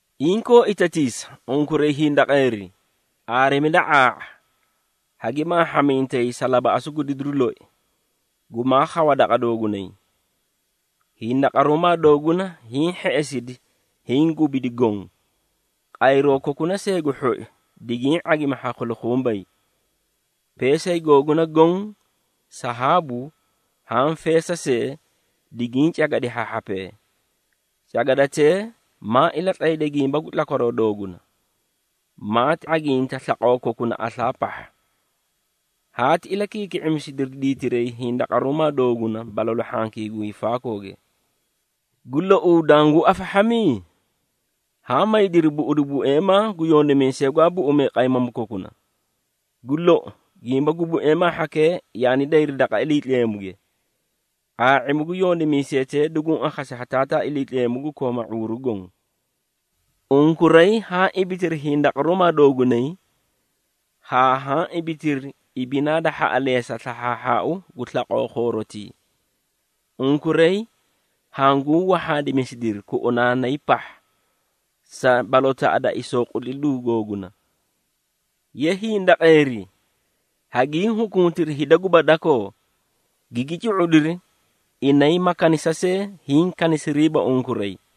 Inkoo itatiisa, unkuray hindaqeeri! Aarimida ⁄aa⁄a, hagi maahhamintay sa labaꞌasu gu didiru loi, gumaa khawa daqa doogunay. Hindaqaruumaa dooguna hiĩ hheꞌesidi, hiĩ gubidi goõ, qayroo kokuna see gu hhoi digiĩ ⁄agimi ha khulukhumbay. Peesay googuna goõ, sahaabu haã feesa see, digiĩ cagadi ha hhapee. Cagadatee maa ilatlayda gimba gu tlakwaroo dooguna, maati ⁄aginta slaqoo kokuna aslaa pahha. Haati ilakiiki⁄imisidiri diitiray hindaqaruumaa da didiri balalu hhankii gu hiifaakooge. Gu louu, danguũ afahhami? Haã maydiri buꞌudu bueemaa gu yondimiisee gwaa buꞌumee qaymamuu kokuna. Gu lou, gimba gu bueemaa hhakee yaani day daqa Iliitleemuge, ⁄aa⁄imuu gu yondimiisetee duguũ akhasi ha Taataa Iliitleemu gu kooma ⁄uuru goõ. Unkuray haã ibitiri hindaqaruumaa doogunay haa haã ibitiri ibinaa da hhaꞌaleesa slahhaahhau gu slaqoo khoorotii. Unkuray hanguũ wahhaadimisidiri kuꞌunaanaykaꞌa pahha sa balotaꞌa da isooqutlidu googuna. Ye hindaqeeri, hagiĩ hukuntiri hida guba dakoo, gigi cu⁄udiri, inay ma kanisa see, hiĩ kanisiriiba unkuray.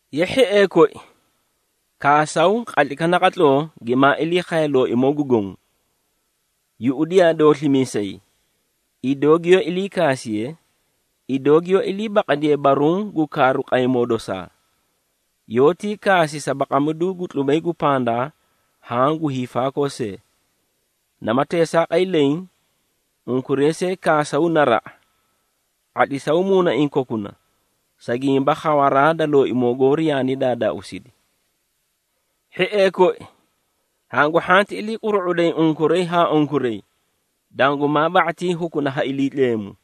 Ye hhiee koi, kaasaw qatlaykaꞌa naqatloo, gimaa ilii khaye Looimoo gu Goõ. Yuꞌudiyaa dooslimiisay, idoo giyoó iliikaasiye, idoo giyoó ilii baqadiye baruũ gu kaaru qaymoo dosaa. Yoótii kaasi sa baqamidu gu tlubay gu pandaa haã gu hiifaakoo see. Nama teesaaqay leẽ, unkuray see kaasaw naraꞌa, ⁄atlisaw muunaiĩ kokuna, sa gimba khawaraa da Looimoo goori yaani daadaauusidi. Hhiee koi, hangu hhanti ilii quru⁄uday unkuray haa unkuray, dangumaa ba⁄atii hukuna ha Iliitleemu.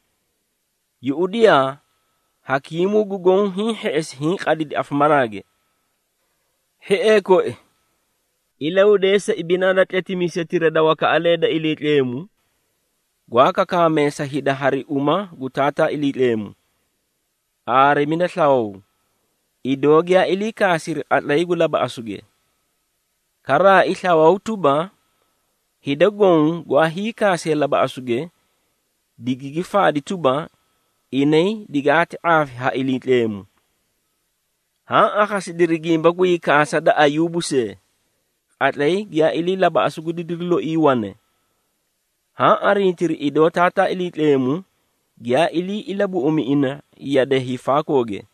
Yuꞌudiyaa, hakiimuu gu goõ hiĩ hheꞌesi, hiĩ qadidi afamaraage. Hhiee koi, ilahudeesa ibinaa da tletimiisetira da wakaꞌalee da Iliitleemu, gwaa kakaamee sa hida hari uma gu Taataa Iliitleemu. Aarimida slawaw, idoo giyaa ilii kaasiri qatlay gu labaꞌasuge. Karaai slawaw tuba, hida goõ gwaa hiikaasee labaꞌasuge digigi faadi tuba, inay digaati ⁄aafi ha Iliitleemu. Haã akhasidiri gimba gu hiikaasa da Ayuubu see, qatlay giyaa ilii labaꞌasu gu didiru loii wane. Haã arintiri idoo Taataa Iliitleemu giyaa ilii ilabuꞌumi ina yade hiifaakooge.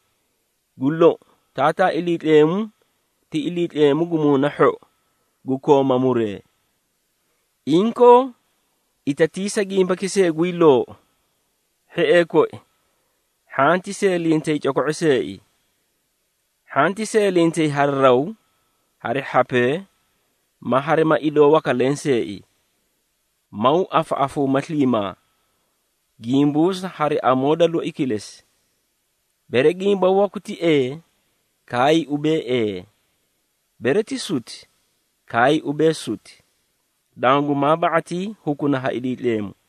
Gu lou, Taataa Iliitleemu ti Iliitleemu gu muuna hhou, gu kooma muree! Inkoo, itatiisa gimbaki see guyii loou. Hhiee koi, hhanti seelintay coko⁄o seei. Hhanti seelintay hari raw, hari hhapee, ma harima idoo waka lenseei. Maw afaꞌafuuma sliimaa, gimbuusa hari amoo da loi kilesi. Bere gimba waku ti ee, kaay ubee, “Ee.” Bere ti suti, kaay ubee, “Suti,” dangumaa ba⁄atii hukuna ha Iliitleemu.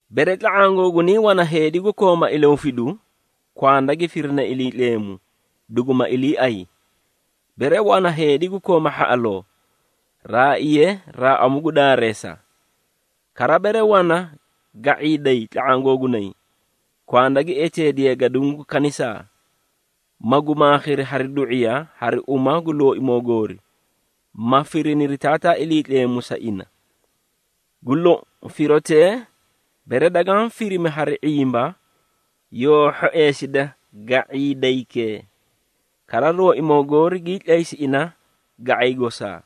Bere tla⁄aã googunay wana heedi gu kooma ilahufidu, kwanda gi firine Iliitleemu, duguma iliiay. Bere wana heedi gu kooma hhaꞌaloo, raaiye raaꞌamu gu daareesa. Kara, bere wana ga⁄iiday tla⁄aã googunay, kwanda gi eteediye gaduũ gu kanisaa, magu maakhiri hari du⁄iya hari uma gu Looimoo goori, ma firiniri Taataa Iliitleemu sa ina. Gu lou, firotee, bere dagaã firimi hari ⁄imba, yoo hhoeesida ga⁄iidaykee, kara Looimoo goori gii tlaysi ina ga⁄ay gosaa.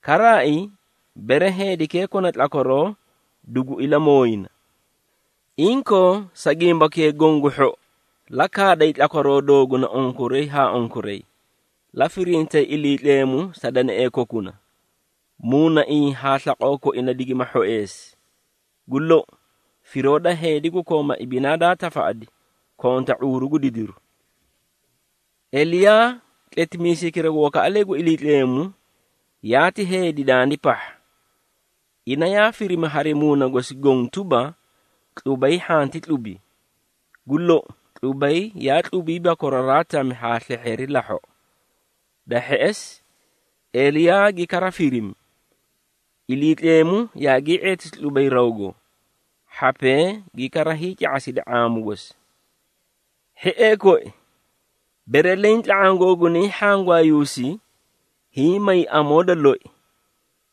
Karaai, bere heedikee kona tlakwaroo, dugu ilamooyina. Inkoo, sa gimbakee goõ gu hhou, la kaaday tlakwaroo dooguna unkuray haa unkuray, la firintay Iliitleemu sa deneꞌee kokuna, muunaiĩ haa slaqoo koina digima hhoeesi. Gu lou, firoo da heedi gu kooma ibinaa daa tafaꞌadi konta ⁄uuru gu didiru. Eliyaa, tletimiisaykira gu wakaꞌalee gu Iliitleemu, yaati heedi dandiray pahha. Ina yaa firimi hari muuna gosi goõ tuba, tlubay hhanti tlubi. Gu lou, tlubay yaa tlubiiba koraraa tami haa slehheeri lahhoꞌo. Da hheꞌesi, Eliyaa gi kara firimi, Iliitleemu yaagii ⁄eetisi tlubay rawgo, hhapee gi kara hiica⁄asidi ⁄aamu gosi. Hhiee koi, bere leẽ tla⁄aã googunay hhangwaayuusi, hiĩ may amoo da loi,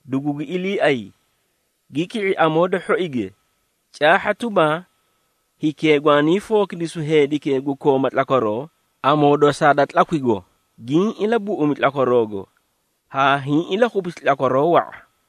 dugugi iliiay, gi ki⁄i amoo da hhoige, caahha tuba, hikee gwaanii fookidisu heedikee gu kooma tlakwaroo amoo dosaa da tlakwigo, giĩ ilabuꞌumi gwaaꞌaraago, haa hiĩ ilakhupisi tlakwaroo wa⁄a.